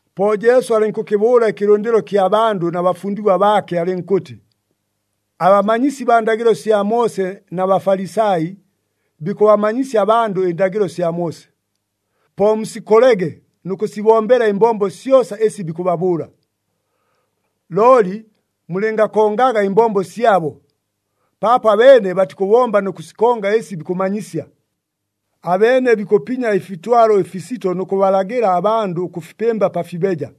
Po Jesu alɨnkʉkɨbʉʉla ɨkɨlʉndɨlo kya bandʉ na bafundigwa baake alɨnkʉtɨ, “Abamanyisi baa ndagɨlo sya Moose na Bafalisai bikʉbamanyisya abandʉ ɨndagɨlo sya Moose. Po musikolege nʉ kʉsibombela ɨmbombo syosa ɨsi bikʉbabʉʉla. Looli mulɨngakongaga ɨmbombo syabo, paapo abeene batikʉbomba nʉ kʉsikonga ɨsi bikʉmanyisya. Abeene bikʉpinya ɨfitwalo ɨfisito nʉ kʉbalagɨla abandʉ ʉkʉfipɨmba pa fibeja,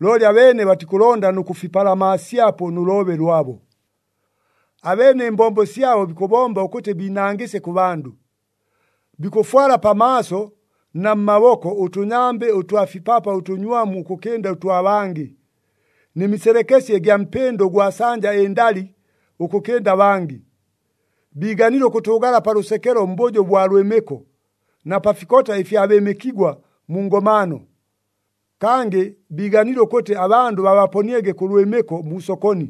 looli abeene batikʉlonda nʉ kʉfipalamaasyapo nʉ loobe lwabo. Abeene ɨmbombo syabo bikʉbomba ʉkʉtɨ biinangɨsye kʉ bandʉ. Bikʉfwala pamaaso na mmaboko ʉtʉnyambɨ ʉtwa fipapa ʉtʉnywamu ʉkʉkɨnda ʉtwa bangɨ, nɨ miselekesye ɨgya mpɨndo ʉgwa sanja ɨndali ʉkʉkɨnda abangɨ. Biiganile ʉkʉtʉʉgala pa lʉsekelo mbʉjo ʉbwa lwɨmɨko, na pa fikota ɨfya bɨɨmɨkigwa mu ngomaano. Kangɨ biiganile ʉkʉtɨ abandʉ babaponiege kʉ lwɨmɨko mu sokoni,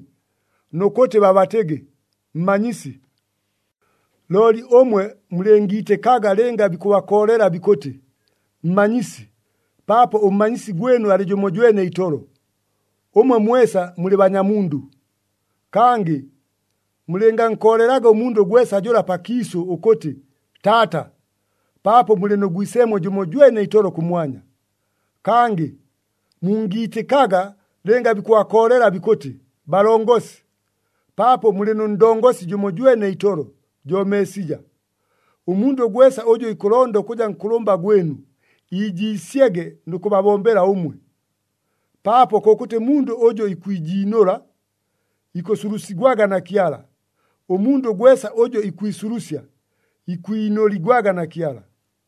nʉ kʉtɨ babatɨgɨ, ‘Mmanyisi.’ “Looli ʉmwe mulɨngiitɨkaga lɨnga bikʉbakoolela bikʉtɨ, ‘Mmanyisi,’ paapo ʉmmanyisi gwɨnu alɨ jʉmojwene itolo, ʉmwe mwesa mulɨ banyamundʉ. Kangɨ mulɨngankoolelaga ʉmundʉ gwesa jʉla pakiisʉ ʉkʉtɨ, ‘Taata,’ paapo mulɨ nʉ Gwiseemwe jʉmojwene itolo kʉmwanya. Kangɨ mungiitɨkaga lɨnga bikʉbakoolela bikʉtɨ, ‘Balongosi,’ paapo mulɨ nʉ Ndongosi jʉmojwene itolo, jo Meesija. Ʉmundʉ gwesa ʉjʉ ikʉlonda ʉkʉja nkʉlʉmba gwɨnu, iijiisyege nʉ kʉbabombela ʉmwe. Paapo kʉkʉtɨ mundʉ ʉjʉ ikwijiinʉla, ikʉsulusigwaga na Kyala, ʉmundʉ gwesa ʉjʉ ikwisulusya, ikwinʉligwaga na Kyala.”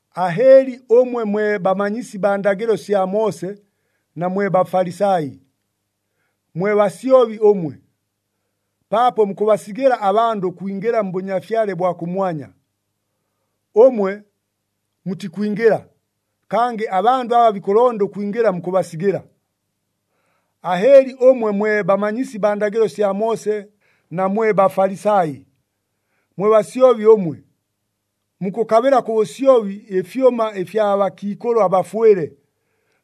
“Ahɨɨli ʉmwe mwe bamanyisi baa ndagɨlo sya Moose na mwe Bafalisai, mwe basyobi ʉmwe! Paapo mukʉbasigɨla abandʉ ʉkwingɨla mBʉnyafyale bwa kʉmwanya. Ʉmwe mutikwingɨla, kangɨ abandʉ aba bikʉlonda ʉkwingɨla mukʉbasigɨla. [ “Ahɨɨli ʉmwe mwe bamanyisi baa ndagɨlo sya Moose na mwe Bafalisai, mwe basyobi ʉmwe! Mukʉkabɨla kʉ bʉsyobi ɨfyʉma ɨfya bakiikʉlʉ abafwɨle,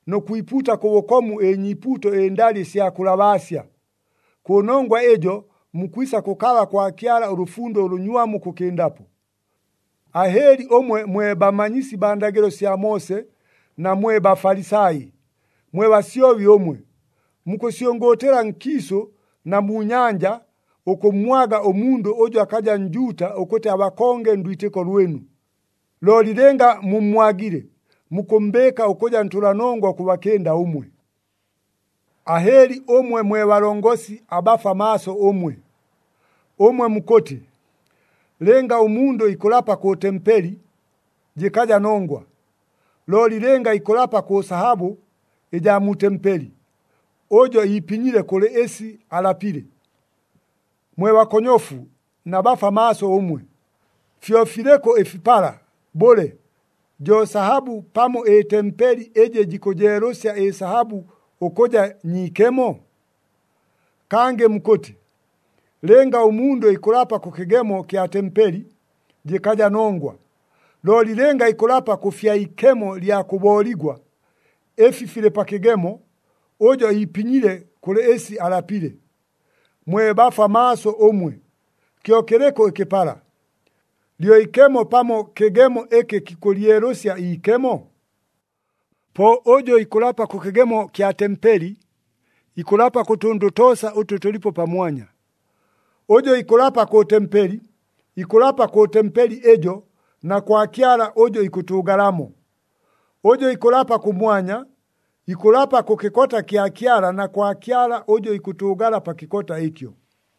nʉ kwipuuta kʉ bʉkomu ɨnyiipuuto ɨndali ɨsya kʉlabaasya. Kʉnongwa ɨjo mukwisa kʉkaba kwa Kyala ʉlʉfundo ʉlʉnywamu ʉkʉkɨndapo.] “Ahɨɨli ʉmwe mwe bamanyisi baa ndagɨlo sya Moose na mwe Bafalisai, mwe basyobi ʉmwe! Mukʉsyʉngʉʉtɨla nkiisʉ na mu nyanja ʉkʉmmwaga ʉmundʉ ʉjʉ akaja Njuuta ʉkʉtɨ abakonge ndwitɨko lwɨnu. Looli lɨnga mummwagile, mukʉmmbɨɨka ʉkʉja ntʉlanongwa ʉkʉbakɨnda ʉmwe. “Ahɨɨli ʉmwe mwe balongosi abafwa maaso ʉmwe! Ʉmwe mukʉtɨ, ‘Lɨnga ʉmundʉ ikʉlapa kʉ tempeli, jɨkaja nongwa. Looli lɨnga ikʉlapa kʉ sahabʉ ɨjaa mu tempeli, ʉjo iipinyile kʉlɨ ɨsi alapile.’ Mwe bakonyofu na bafwa maaso ʉmwe! Fyo filɨkʉ ɨfipala, bʉle, jo sahabʉ pamo ɨtempeli ɨjɨ jikʉjeelʉsya ɨsahabʉ ʉkʉja nyiikemo? Kangɨ mukʉtɨ, ‘Lɨnga ʉmundʉ ikʉlapa kʉ kɨgemo kya tempeli, jɨkaja nongwa. Looli lɨnga ikʉlapa kʉ fya ikemo lya kʉbooligwa, ɨfi filɨ pa kɨgemo, ʉjo iipinyile kʉlɨ ɨsi alapile.’ Mwe bafwa maaso ʉmwe! Kyo kɨlɨkʉ ɨkɨpala, lyo ikemo pamo kɨgemo ɨkɨ kikʉlyelʉsya iikemo? Po ʉjʉ ikʉlapa kʉ kɨgemo kya tempeli, ikʉlapa kʉ tʉndʉ toosa ʉtʉ tʉlipo pamwanya. Ʉjʉ ikʉlapa kʉ tempeli, ikʉlapa kʉ tempeli ɨjo na kwa Kyala ʉjʉ ikʉtʉʉgalamo. Ʉjʉ ikʉlapa kʉmwanya, ikʉlapa kʉ kɨkota kya Kyala na kwa Kyala ʉjʉ ikʉtʉʉgala pa kɨkota ɨkyo.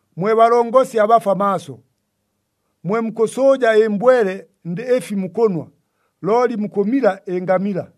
Mwe balongosi abafwa maaso! Mwe mukʉsʉʉja ɨmbwele ndɨ ɨfi mukʉnwa, looli mukʉmila ɨngamila!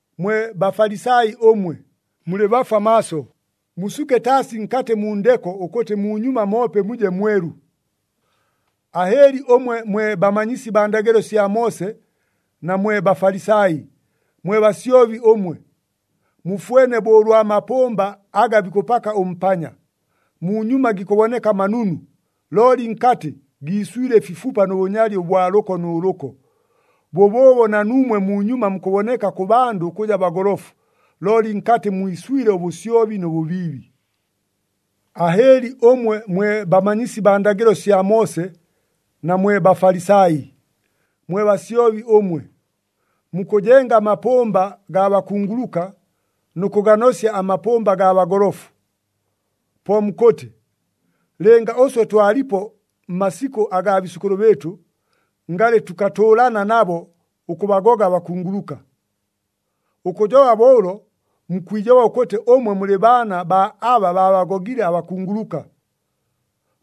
Mwe Bafalisai ʉmwe, mulɨ bafwa maaso! Musuke taasi nkatɨ mu ndeko ʉkʉtɨ munyuma moope muje mwelu. “Ahɨɨli ʉmwe mwe bamanyisi baa ndagɨlo sya Moose na mwe Bafalisai, mwe basyobi ʉmwe! Mufwene bo ʉlwa mapʉmba aga bikʉpaka ʉmpanya. Munyuma gikʉboneka manunu, looli nkatɨ giiswile ɨfifupa nʉ bʉnyali ʉbwa lʉko nʉ lʉko. Bʉbʉʉbo na nuumwe munyuma mukʉboneka kʉ bandʉ ʉkʉja bagolofu, looli nkatɨ mwiswile ʉbʉsyobi nʉ bʉbiibi. “Ahɨɨli ʉmwe mwe bamanyisi baa ndagɨlo sya Moose na mwe Bafalisai, mwe basyobi ʉmwe! Mukʉjenga amapʉmba gaa bakunguluka nʉ kʉganosya amapʉmba gaa bagolofu. Po mukʉtɨ, ‘Lɨnga ʉswe twalipo mmasikʉ agaa biisʉkʉlʉ bɨɨtʉ, ngalɨ tʉkatʉʉlana nabo ʉkʉbagoga abakunguluka.’ Ʉkʉjoba bo ʉlo, mukwijoba ʉkʉtɨ ʉmwe mulɨ baana baa aba baabagogile abakunguluka!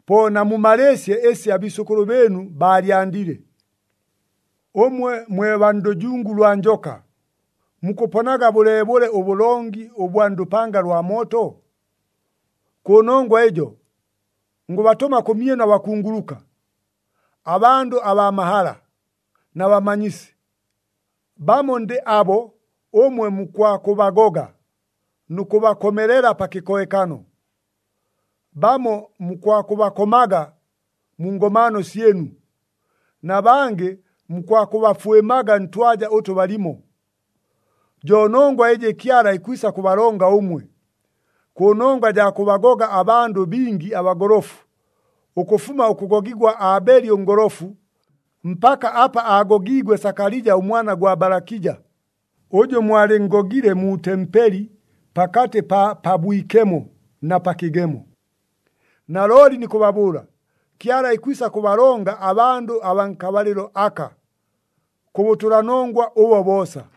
Po namumalɨɨsye ɨsi abiisʉkʉlʉ bɨɨnu baalyandile! “Ʉmwe mwe baa ndʉjungu lwa njoka! Mukʉponaga bʉleebʉle ʉbʉlongi ʉbwa ndʉpanga lwa mooto? Kʉnongwa ɨjo, ngʉbatʉma kʉmyɨnu abakunguluka, abandʉ abaa mahala, na bamanyisi. Bamo ndɨ abo ʉmwe mukwakʉbagoga nʉ kʉbakomelela pa kɨkohekano, bamo mukwakʉbakomaga mu ngomaano syɨnu, na bangɨ mukwakʉbafwɨmaga ntwaja ʉtʉ balimo. Jo nongwa ɨjɨ Kyala ikwisa kʉbalonga ʉmwe, kʉnongwa jaa kʉbagoga abandʉ bingi abagolofu, ʉkʉfuma ʉkʉgogigwa Aabeli ʉngolofu, mpaka apa aagogiigwe Sakalija ʉmwana gwa Balakija, ʉjʉ mwalɨnngogile mu tempeli pakatɨ pa Pabwikemo na pa kɨgemo. Nalooli nikʉbabʉʉla, Kyala ikwisa kʉbalonga abandʉ abaa nkabalɨlo aka kʉ bʉtʉlanongwa ʉbo boosa.”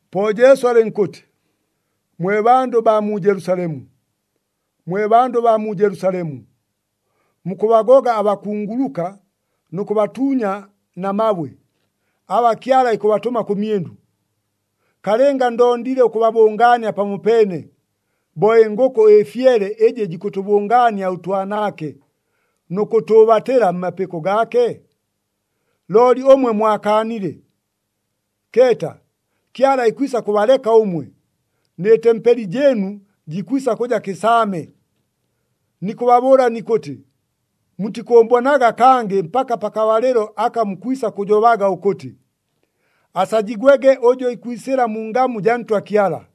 Po Jesu alɨnkʉtɨ, “Mwe bandʉ baa mu Jelusalemu, mwe bandʉ baa mu Jelusalemu! Mukʉbagoga abakunguluka nʉ kʉbatuunya na mabwe aba Kyala ikʉbatʉma kʉmyɨnu. Kalɨnga ndondile ʉkʉbabʉngaania pamopeene, bo ɨngʉkʉ ɨfyele ɨjɨ jikʉtʉbʉngaania ʉtwanaake nʉ kʉtʉʉbatɨla mmapɨko gaake? Looli ʉmwe mwakaanile! Keeta, Kyala ikwisa kʉbaleka ʉmwe, nɨ tempeli jɨɨnu jikwisa kʉja kɨsaame! Nikʉbabʉʉla nikʉtɨ, mutikʉʉmbonaga kangɨ mpaka pakabalɨlo aka mukwisa kʉjobaga ʉkʉtɨ, ‘Asajigwege ʉjʉ ikwisɨla mu ngamu jaa Ntwa Kyala!’”